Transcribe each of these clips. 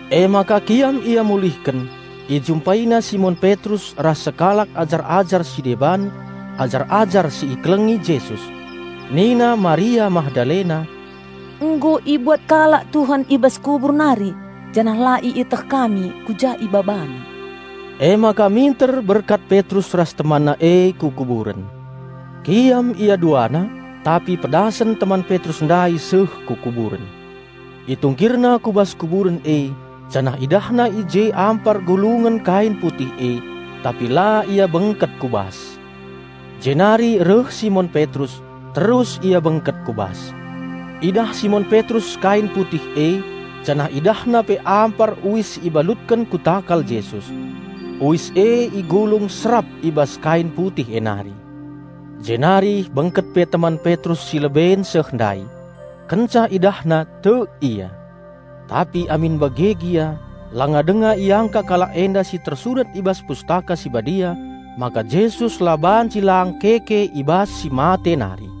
Emaka kiam ia mulihken: ijumpaina Simon Petrus ras sekalak ajar-ajar si deban, ajar-ajar si ikelengi Jesus. Nina Maria Magdalena, "Nggo ibuat kalak Tuhan i bas kubur nari janah la ieteh kami ku ja ibabana!" Emaka minter berkat Petrus ras temanna e ku kuburen. Kiam ia duana, tapi pedasen teman Petrus ndai seh ku kuburen. Itungkirna ku bas kuburen e janah idahna i je ampar gulungen kain putih e, tapi la ia bengket ku bas. Jenari reh Simon Petrus, terus ia bengket ku bas. Idah Simon Petrus kain putih e, janah idahna pe ampar uis si ibalutken ku takal Jesus. Uis e igulung serap i bas kain putih e nari. Jenari bengket pe teman Petrus si leben seh ndai. Kenca idahna tek ia. (Tapi amin bage gia, langa denga iangka kalak enda si tersurat i bas Pustaka Si Badia maka Jesus la banci lang keke i bas si mate nari.)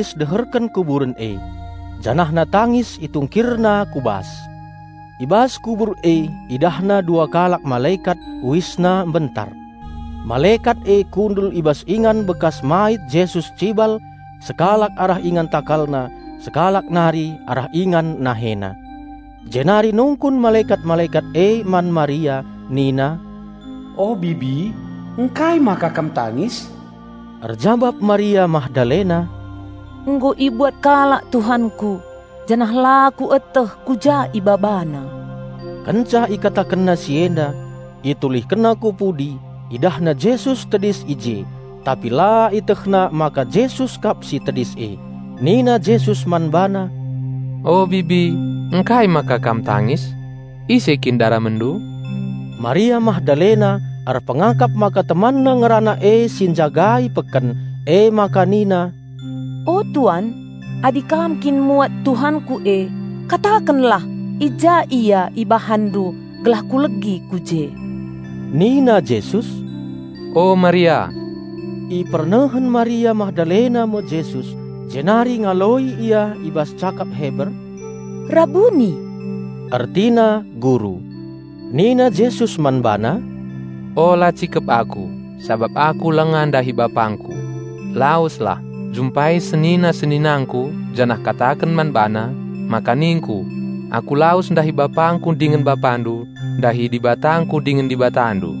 Maria Magdalena tedis deherken kuburen e. Janahna tangis itungkirna ku bas. I bas kubur e idahna dua kalak malekat, uisna mbentar. Malekat e kundul i bas ingan bekas mait Jesus cibal, sekalak arah ingan TakalNa, sekalak nari arah ingan NaheNa. Jenari nungkun malekat-malekat e man Maria nina, "O bibi, ngkai maka kam tangis?" Erjabap Maria Magdalena, "Nggo ibuat kalak Tuhanku, janah la kueteh ku ja ibabana!" Kenca ikatakenna si enda, itulihkenna ku pudi, idahna Jesus tedis i je; tapi la ietehna maka Jesus kap si tedis e. Nina Jesus man bana, "O bibi, ngkai maka kam tangis? Ise kin daramenndu?" Maria Magdalena erpengakap maka temanna ngerana e si njagai peken, emaka nina, "O tuan, adi kam kin muat Tuhanku e, katakenlah i ja Ia ibahanndu gelah kulegi ku je." Nina Jesus, "O, Maria!" Ipernehen Maria Magdalena me Jesus, jenari ngaloi ia i bas cakap Heber, "Rabuni!" (Ertina, "Guru!") Nina Jesus man bana, "Ola cikep Aku, sabap Aku langa ndahi BapangKu. Laweslah, jumpai senina-seninangKu janah kataken man bana, maka ningKu: Aku lawes ndahi BapangKu dingen BapaNdu, ndahi DibataKu dingen Dibatandu."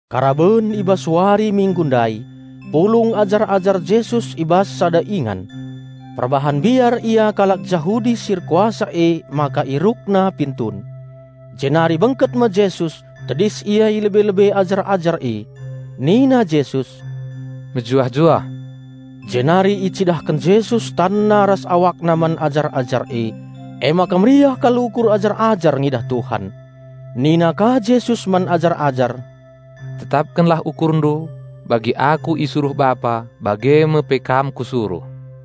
Karaben i bas wari Minggu ndai, pulung ajar-ajar Jesus i bas sada ingan. Perbahan mbiar ia kalak Jahudi si erkuasa emaka ierukna pintun. Jenari bengket me Jesus, tedis Ia i lebe-lebe ajar-ajar e. Nina Jesus, "Mejuah-juah." Jenari icidahken Jesus TanNa ras AwakNa man ajar-ajar e, emaka meriah kal ukur ajar-ajar ngidah Tuhan. Nina ka Jesus man ajar-ajar, "Tetapkenlah ukurndu. Bagi Aku isuruh Bapa, bage me pe kam Kusuruh."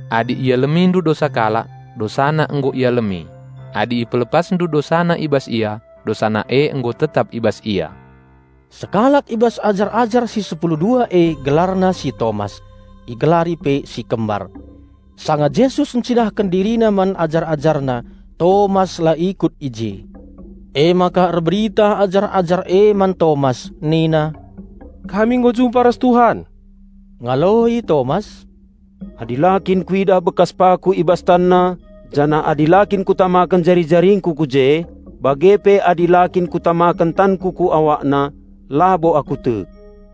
Adi ialemindu dosa kalak, dosana nggo ialemi; adi ipelepasndu dosana i bas ia, dosana e nggo tetap i bas ia." Sekalak i bas ajar-ajar si sepulu dua e gelarna si Tomas (igelari pe si Kembar). Sanga Jesus encidahken DiriNa man ajar-AjarNa, Tomas la ikut i je. Emaka erberita ajar-ajar e man Tomas nina, "Kami nggo jumpa ras Tuhan!" Ngaloi Tomas, "Adi la kin kuidah bekas paku i bas TanNa, janah adi la kin kutamaken jari-jaringku ku je bage pe adi la kin kutamaken tanku ku AwakNa, labo aku tek."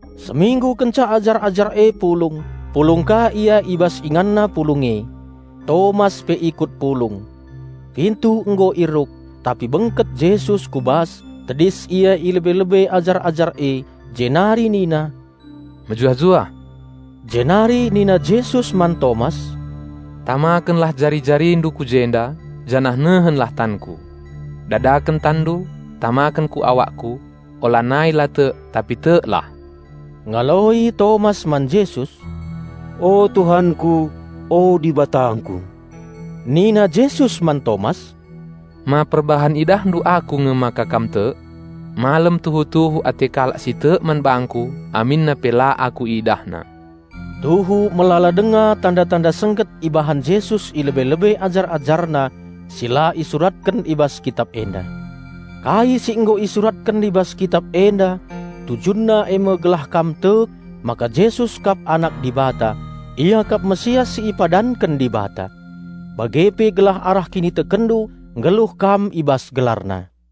Seminggu kenca ajar-ajar e pulung, pulung ka ia i bas inganna pulung e. Tomas pe ikut pulung. Pintu nggo ieruk, tapi bengket Jesus ku bas, tedis Ia i lebe-lebe ajar-ajar e, jenari nina, "Mejuah-juah!" Jenari nina Jesus man Tomas, "Tamakenlah jari-jarindu ku jenda, janah nehenlah tanKu. Dadaken tanndu, tamaken ku awakKu. Olanai la tek, tapi teklah!" Ngaloi Tomas man Jesus, "O, Tuhanku! O, Dibatangku!" Nina Jesus man Tomas, "Ma perbahan idahndu Aku nge maka kam tek? Malem tuhu-tuhu ate kalak si tek man bangKu aminna pe la Aku idahna!" Tuhu melala denga tanda-tanda sengget ibahan Jesus i lebe-lebe ajar-AjarNa si la isuratken i bas Kitap enda. Kai si nggo isuratken i bas Kitap enda tujunna e me gelah kam tek maka Jesus kap Anak Dibata; Ia kap Raja Penampat si ipadanken Dibata. Bage pe gelah arah kinitekenndu nggeluh kam i bas gelarna!